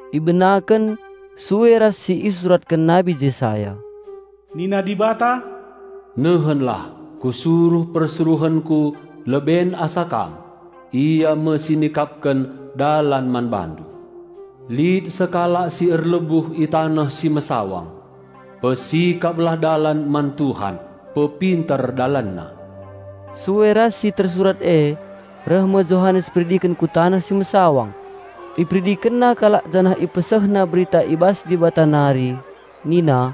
Ibenaken sue ras si isuratken Nabi Jesaya, "Nina Dibata, 'Nehenlah, Kusuruh persuruhenKu leben asa Kam, ia me si nikapken dalan man BaNdu.' Lit sekalak si erlebuh i taneh si mesawang, 'Pesikaplah dalan man Tuhan; pepinter DalanNa!'" Sue ras si tersurat e, reh me Johanes Peridiken ku taneh si mesawang. Iperidikenna kalak janah ipesehna berita i bas Dibata nari nina,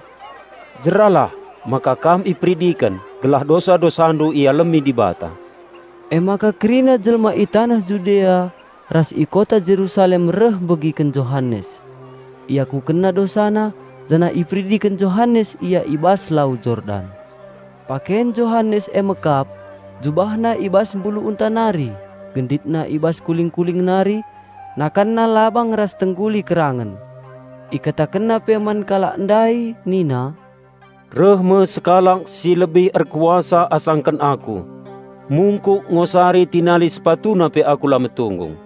"Iperidikenndu min, tandana kam jera i bas dosa-dosandu nari, gelah dosa-dosandu ialemi Dibata." Emaka kerina jelma i taneh Judea ras i kota Jerusalem reh megiken Johanes. Iakukenna dosana janah iperidiken Johanes ia i bas Lau Jordan. Paken Johanes e me kap: jubahna i bas mbulu unta nari, genditna i bas kuling-kuling nari, nakanna labang ras tengguli kerangen. Ikatakenna pe man kalak ndai nina, "Reh me sekalak si lebih erkuasa asangken aku. Mungkuk ngosari tinali sepatuna pe aku la metunggung.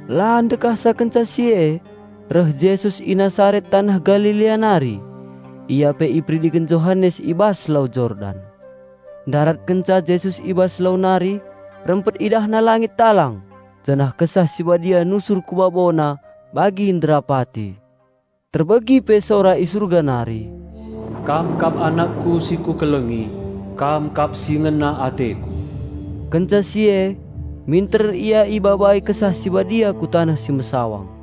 La ndekahsa kenca si e, reh Jesus i Nasaret taneh Galilea nari. Ia pe iperidiken Johanes i bas Lau Jordan. Ndarat kenca Jesus i bas lau nari, rempet IdahNa langit talang, janah Kesah Si Badia nusur ku BaboNa bagi nderapati. Terbegi pe sora i Surga nari, "Kam kap AnakKu si Kukelengi, Kam kap si ngena ateKu." Kenca si e minter Ia ibabai Kesah Si Badia ku taneh si mesawang.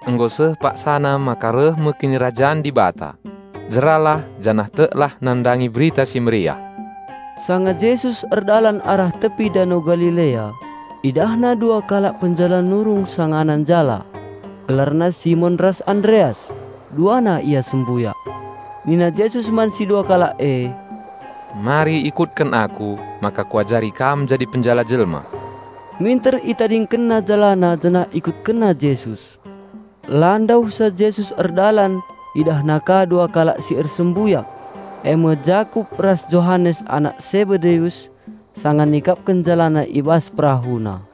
"Nggo seh paksa Kinirajan Dibata reh deherna. Jeralah i bas dosandu nari janah teklah nandangi Berita Si Mehuli!" Sanga Jesus erdalan arah tepi Dano Galilea, IdahNa dua kalak penjala nurung sangana njala. Gelarna Simon ras Andreas; duana ia sembuyak. Nina Jesus man si dua kalak e, "Mari ikutken Aku, maka Kuajari kam ndilo kalak si deban jadi ajar-ajarKu." Minter itadingkenna jalana janah ikutkenna Jesus. La ndauhsa Jesus erdalan IdahNa ka dua kalak si ersembuyak, e me Jakup ras Johanes anak Sebedeus, sanga nikapken jalana i bas perahuna.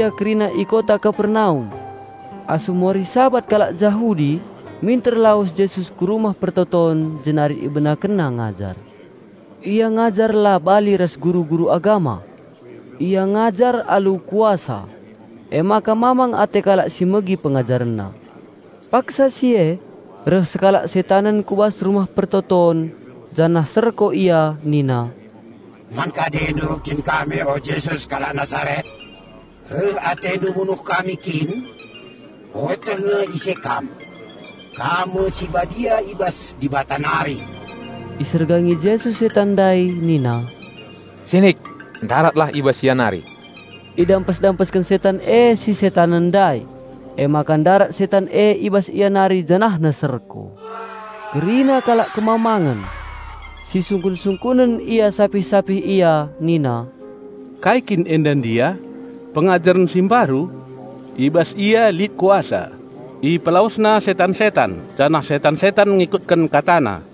Seh ia kerina i kota Kapernaum. Asum wari Sabat kalak Jahudi minter lawes Jesus ku rumah persembahen jenari IbenakenNa ngajar. Ia ngajar la bali ras guru-guru agama. Ia ngajar alu kuasa. Emaka mamang ate kalak si megi PengajarenNa. Paksa si e reh sekalak setanen ku bas rumah persembahen janah serko ia nina, "Man kadendu kin kami o, Jesus kalak Nasaret? Reh AteNdu munuh kami kin? Kueteh nge ise Kam. Kam me persuruhen Dibata!" Isergangi Jesus setan ndai nina, "Sinik! Ndaratlah i bas ia nari!" Idampes-dampesken setan e si setanen ndai, emaka ndarat setan e i bas ia nari janahna serko. Kerina kalak kemamangen. Si sungkun-sungkunen ia sapih-sapih ia nina, "Kai kin enda ndia? Pengajaren si mbaru? I bas Ia lit kuasa. IpelawesNa setan-setan, janah setan-setan ngikutken KataNa!"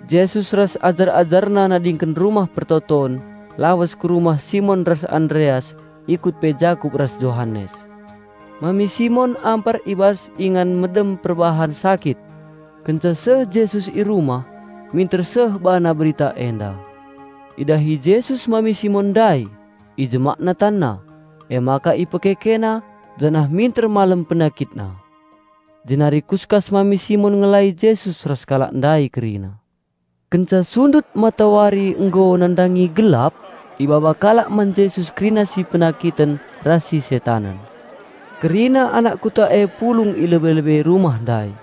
Jesus ras ajar-AjarNa nadingken rumah persembahen, lawes ku rumah Simon ras Andreas, ikut pe Jakup ras Johanes. Mami Simon ampar i bas ingan medem perbahan sakit. Kenca seh Jesus i rumah, minter seh BaNa berita enda. Idahi Jesus mami Simon ndai, IjemakNa tanna, emaka IpekekeNa, janah minter malem penakitna. Jenari kuskas mami Simon ngelai Jesus ras kalak ndai kerina. Kenca sundut matawari nggo, nandangi gelap, ibaba kalak man Jesus kerina si penakiten ras si setanen. Kerina anak kuta e pulung i lebe-lebe rumah ndai.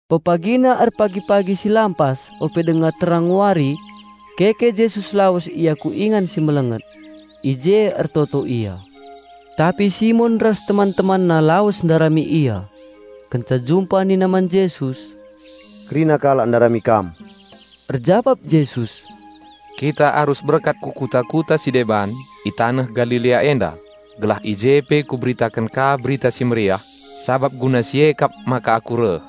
Pepagina erpagi-pagi si lampas ope denga terang wari keke Jesus lawes Ia ku ingan si melenget. I je ertoto Ia ertoto. Tapi Simon ras teman-temanna lawes ndarami Ia. Kenca jumpa nina man Jesus, "Kerina kalak ndarami Kam." Erjabap Jesus, "Kita arus berkat ku kuta-kuta si deban, i taneh Galilea enda, gelah i je pe Kuberitaken ka Berita Si Meriah. Sabap guna si e kap maka Aku reh."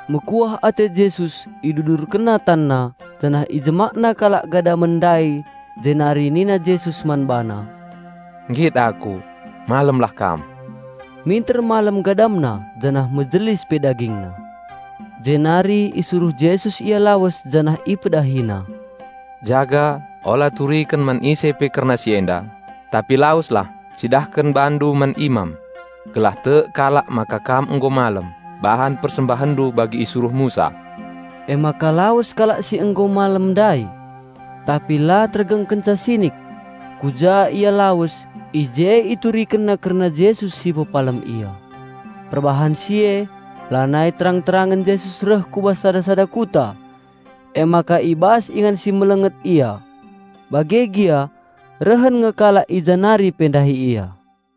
Mekuah ate Jesus IdudurkenNa TanNa janah IjemakNa kalak gadamen ndai jenari nina Jesus man bana, "Nggit Aku, malemlah kam." Minter malem gadamna janah mejelis pe dagingna. Jenari isuruh Jesus ia lawes janah IpedahiNa, "Jaga, ola turiken man ise pe kerna si enda. Tapi laweslah, cidahken bandu man imam. Gelah tek kalak maka kam nggo malem, bahan persembahenndu bagi isuruh Musa." Emaka lawes kalak si nggo malem ndai. Tapi la tergengkenca sinik. Ku ja ia lawes, i je iturikenna kerna Jesus si pepalem ia. Perbahan si e, lanai terang-terangen Jesus reh ku bas sada-sada kuta. Emaka i bas ingan si melenget Ia. Bage gia rehen nge kalak i ja nari pe ndahi Ia.